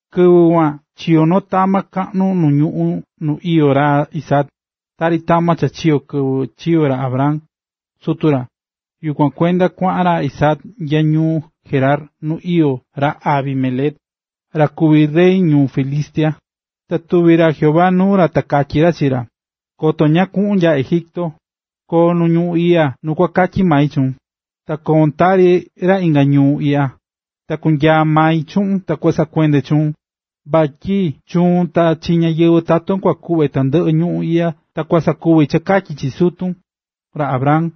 Kɨvɨ kuan chiyo̱ noo tama kaꞌnu nu ñuꞌún nu iyó ra Isaac, tari tama cha chiyo̱ kɨvɨ chiyo̱ ra Abraham, sutu ra. Yukuan kuenda kuaꞌan ra Isaac nya ñuu Gerar nu iyó ra Abimelec, ra kuví rey ñáyɨvɨ Filistia. Ta tuvi̱ ra Jehová nuu ra ta katyí ra chi ra: “Koto ñaꞌan kuꞌun nya Egipto, ko̱o nu ñuꞌún iꞌya nu ku katyi mai chuun. Ta koun tari ra inga ñuu iꞌya, ta kunyaa mai chuꞌun ta kua nasoke chuun, vatyi chuun ta chi ñáyɨvɨ taton kua kuꞌve tandɨꞌɨ ñuꞌún iꞌya ta ku sakuvi cha katyi chi sutun, ra Abraham.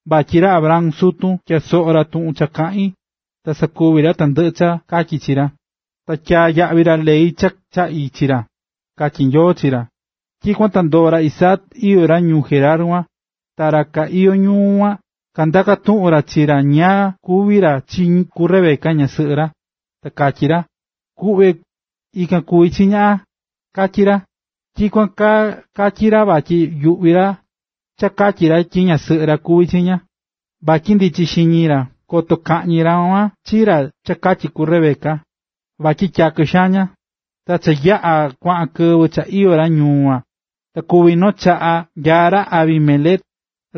Vatyi ra Abraham, sutun, tyaa̱ soꞌo ra tuꞌun kaꞌín ta sakuvi̱ ra tandɨꞌɨ cha tachi̱ chi ra, ta tyaa̱ yaꞌvi ra ley cha chaꞌi̱ chi ra”, katyí Nyoo chi ra. Tyikuan ta ndoo̱ ra Isaac iyó ra ñuu Gerar kuan. Ta ra ka iyó ñuu kuan kandaka̱ tuꞌun ra chi ra ñáá kuví ra chi ku Rebeca ñasɨꞌɨ ra, ta katyí ra: ―Kuꞌve, ikan kuví chi ña ―katyí ra. Tyikuan kaa katyí ra vatyi yuꞌví ra cha katyi ra tyi ñasɨꞌɨ ra kuví chi ña, vatyi ndichí xiñi ra koto kakaꞌñi ra kuan chi ra cha katyi ku Rebeca, vatyi tyakɨ xaan ña. Ta cha yaꞌa̱ kuaꞌa kɨvɨ cha iyó ra ñuu kuan, ta kuvi̱ noo chaꞌa cha nyaá ra Abimelec,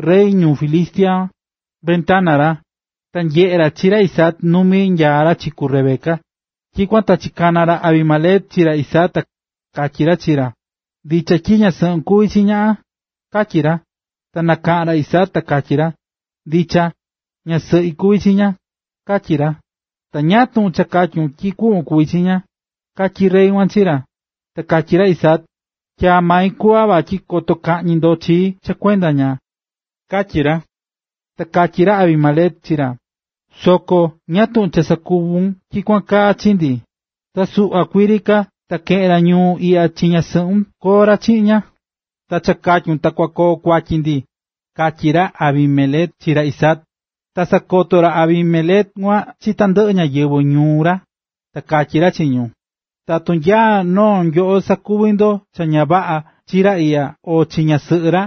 rey ñu Filistia, ventana ra, ta nyeꞌe̱ ra chi ra Isaac numí nyaa ra chi ku Rebeca. Tyikuan ta chikana̱ ra Abimelec chi ra Isaac, ta katyí ra chi ra: ―¿Ndicha tyi ñasɨꞌun kuví chi ña? ―katyí ra. Ta nakaꞌán ra Isaac ta katyí ra: ―Ndicha, ñasɨꞌi kuví chi ña ―katyí ra. ―Ta ¿ñáá tuꞌun cha katyún tyi kuꞌvon kuví chi ña? ―katyí rey kuan chi ra. Ta katyí ra Isaac: ―Tyaa̱ mai kuꞌva vatyi koto kaꞌñi ndo chii cha kuenda ña ―katyí ra. Ta katyí ra Abimelec chi ra: ―Soko ¿ñáá tuꞌun cha sakuvu̱n tyikuan kaa chi ndi? Ta suꞌva kuii ri ka, ta keꞌe̱n ra ñuu iꞌya chi ñasɨꞌun koo ra chiꞌin ña. Ta cha katyu̱n ta kua koo kuatyi ndi ―katyí ra Abimelec chi ra Isaac. Ta sakoto̱ ra Abimelec kuan chi tandɨꞌɨ ñáyɨvɨ ñuu ra, ta katyí ra chi ñu: ―Tatu nya noo nyoꞌo sakuvi ndo cha ña vaꞌa chi ra iꞌya o chi ñasɨꞌɨ ra,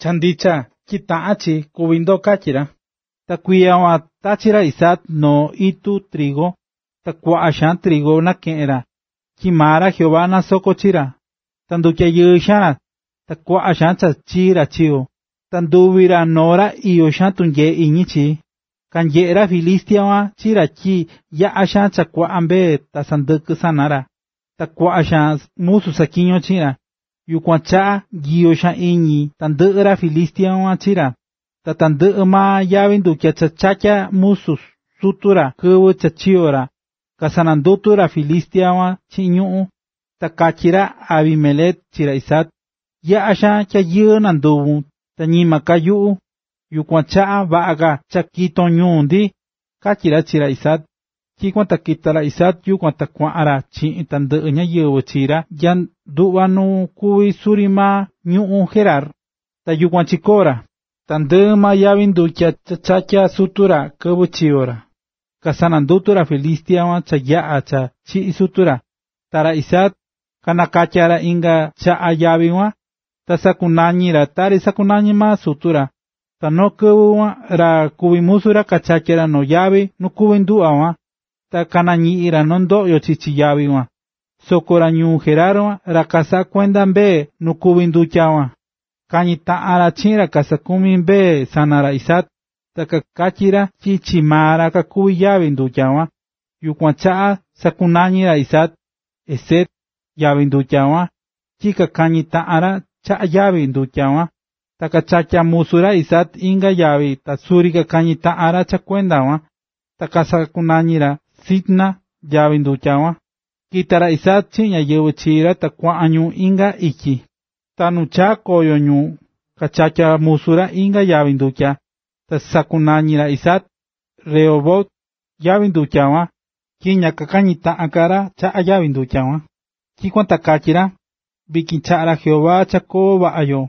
cha ndicha tyi taꞌán chi kúvi ndo ―katyí ra. Ta kuiya kuan tachi̱ ra Isaac noo itu trigu. Ta kuaꞌa xaan trigu nakeꞌe̱n ra, tyi maa ra Jehová nasoko̱ chi ra. Ndutyayɨɨ̱ xaan ra, ta kuaꞌa xaan cha chii ra chikoo̱. Ta nduvi̱ ra noo ra iyó xaan tunyee iñi chi. Kanyeꞌe̱ ra Filistia kuan chi ra tyi yaꞌa̱ xaan cha kuaꞌa mbee ta sɨndɨkɨ sana ra, ta kuaꞌa musu saꞌatyiñó chiꞌin ra. Yukuan chaꞌa nyiyo xaan iñi tandɨꞌɨ ra Filistia kuan chi ra. Ta tandɨꞌɨ maa yavi ndutya cha chatya̱ musu sutu ra kɨvɨ cha chiyo̱ ra, kasanandutu̱ ra Filistia kuan chiꞌin ñuꞌún. Ta katyí ra Abimelec chi ra Isaac: ―Yaꞌa̱ xaan tyayɨɨ nanduvu̱n ta ñima ka nyuꞌu. Yukuan chaꞌa vaꞌa ka cha kiton ñuu ndi ―katyí ra chi ra Isaac. Tyikuan ta kita̱ ra Isaac yukuan ta kuaꞌan ra chiꞌin tandɨꞌɨ ñáyɨvɨ chi ra nya nduꞌva nu kuví suri maa ñuꞌún Gerar, ta yukuan chikoo̱ ra. Tandɨꞌɨ maa yavi ndutya cha chatya̱ sutu ra kɨvɨ chiyo̱ ra, cha kasanandutu̱ ra Filistia kuan cha yaꞌa̱ cha chiꞌi̱ sutu ra, ta ra Isaac nakatya̱ ra inga chaꞌa yavi kuan, ta sakunañi̱ ra tari sakunañi̱ maa sutu ra. Ta noo kɨvɨ kuan ra kuví musu ra kachatyá ra noo yavi nu kuví nduꞌva kuan, ta kanañiꞌi̱n ra noo ndoꞌyo chichi yavi kuan. Soko ra ñuu Gerar, ra kasaꞌá kuenda mbee nu kuví nduꞌva kuan, kañi̱ taꞌan ra chiꞌin ra kasaꞌakumí mbee sana ra Isaac, ta kakatyí ra tyi chi maa ra kuví yavi ndutya kuan. Yukuan chaꞌa sakunañi̱ ra Isaac “Esek” yavi ndutya kuan tyi kakañí taꞌan ra chaꞌa yavi ndutya kuan. Ta kachatya̱ musu ra Isaac inga yavi ta suri kakañi̱ taꞌan ra cha kuenda kuan, ta sakunañi̱ ra “Sitna” yavi ndutya kuan. Kita̱ ra Isaac chiꞌin ñáyɨvɨ chi ra ta kuaꞌan ñu inga ityi, ta nu chaa̱ koyo ñu kachatya̱ musu ra inga yavi ndutya, ta sakunañi̱ ra Isaac “Rehobot” yavi ndutya kuan, tyi ña kakañi̱ taꞌan ka ra chaꞌa yavi kuan. Tyikuan ta katyí ra: “Vityin chaꞌa̱ ra Jehová cha koo vaꞌa yo,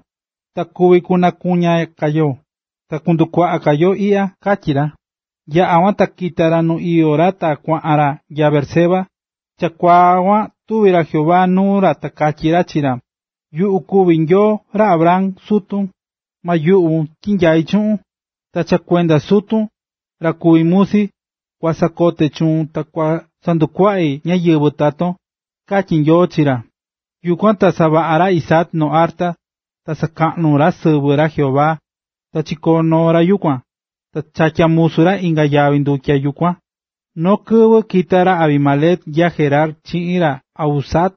ta kuvi kunakuña ka yo ta kundukuaꞌa ka yo iꞌya”, katyí ra. Yaꞌa̱ kuan ta kita̱ ra nu iyó ra ta kuaꞌan ra nya Beerseba. Ta chakuaa kuan tuvi̱ ra Jehová nuu ra ta katyí ra chi ra: “Yuꞌu kuví Nyoo ra Abraham, sutun. Ma yuꞌvun tyi nyaí chuꞌun. Ta cha kuenda sutun, ra kuví musi, kua nasoke chuun ta kua sandukuaꞌi ñáyɨvɨ taton”, katyí Nyoo chi ra. Yukuan ta savaꞌa̱ ra Isaac noo arta, ta sakaꞌnu̱ ra sɨvɨ ra Jehová, ta chicoo̱ noo ra yukuan, ta chatya̱ musu ra inga yavi ndutya yukuan. Noo kɨvɨ kita̱ ra Abimelec nya Gerar chiꞌin ra Ahuzat,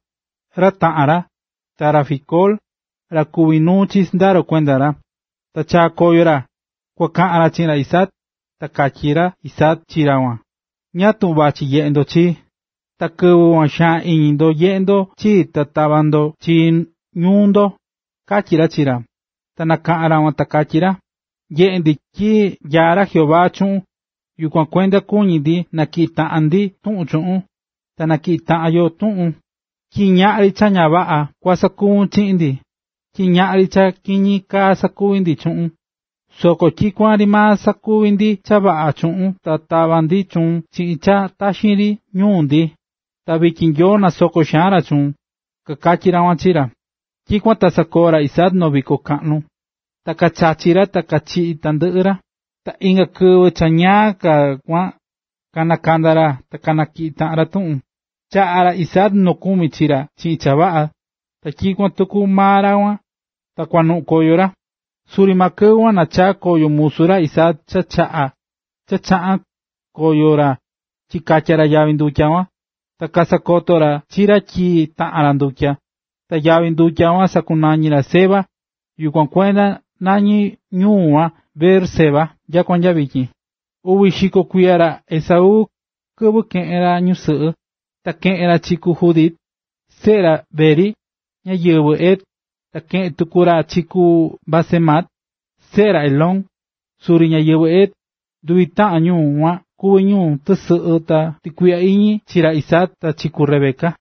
ra taꞌan ra, ta ra Ficol, ra kuví nuu chi sɨndaro kuenda ra, ta chaa̱ koyo ra, kua kaꞌan ra chi ra Isaac. Ta katyí ra Isaac chi ra kuan: ―¿Ñáá tuꞌun vachí nyeꞌe ndo chii, ta kɨvɨ kuan xaan iñi ndo nyeꞌe̱ ndo chii ta tava̱ ndo chii ñuu ndo? ―katyí ra chi ra. Ta kanakaꞌa̱n ra kuan ta kakatyí ra: ―Nyeꞌé ndi tyi nyaá ra Jehová chuꞌun, yukuan kuenda kuñí ndi natyiꞌi taꞌan ndi tuꞌun chuꞌun. Na natyiꞌi taꞌan yoo tuꞌun, tyi ñaꞌri cha ña vaꞌa kua sakuvun chiꞌin ndi, tyi ñaꞌri cha kiñi kaa sakuví ndi chuꞌun, soko tyikuan ri maa sakuví ndi cha vaꞌa chuꞌun ta tava̱ ndi chuun chiꞌin cha taxi ri ñuu ndi. Ta vityin Nyoo nasokó xaan ra chuun ―kakatyí ra kuan chi ra. Tyikuan ta sakoo̱ ra Isaac noo viko kaꞌnu, ta kachachi̱ ta kachiꞌi̱ tandɨꞌɨ ra. Ta inga kɨvɨ cha ñaa ka kuan kanakanda̱ ra ta kanatyiꞌi̱ taꞌan ra tuꞌun. Chaꞌa̱ ra Isaac nokumi chi ra chiꞌin cha vaꞌa, ta tyikuan tuku maa ra kuan, ta kuanuꞌun koyo ra. Suri maa kɨvɨ kuan nachaa̱ koyo musu ra Isaac cha chaꞌa̱n koyo ra chikatya̱ ra yavi ndutya kuan, ta kasakoto̱ ra chi ra tyi taꞌa̱n ra ndutya. Ta yavi ndutya kuan sakunañi̱ ra “Seba”, yukuan kuenda nañí ñuu kuan Beerseba nyakua nya vityin. Uvi xiko kuiya ra Esaú, kɨvɨ keꞌe̱n ra ñusɨꞌɨ, ta keꞌe̱n ra chi ku Judit, seꞌe ra Beeri, ñáyɨvɨ Het, ta keꞌe̱n tuku ra chi ku Basemat, seꞌe ra Elón, suri ñáyɨvɨ Het. Nduvi taꞌan ñu kuan kuví ñu tɨsɨꞌɨ ta tukuiꞌya iñi chi ra Isaac ta chi ku Rebeca.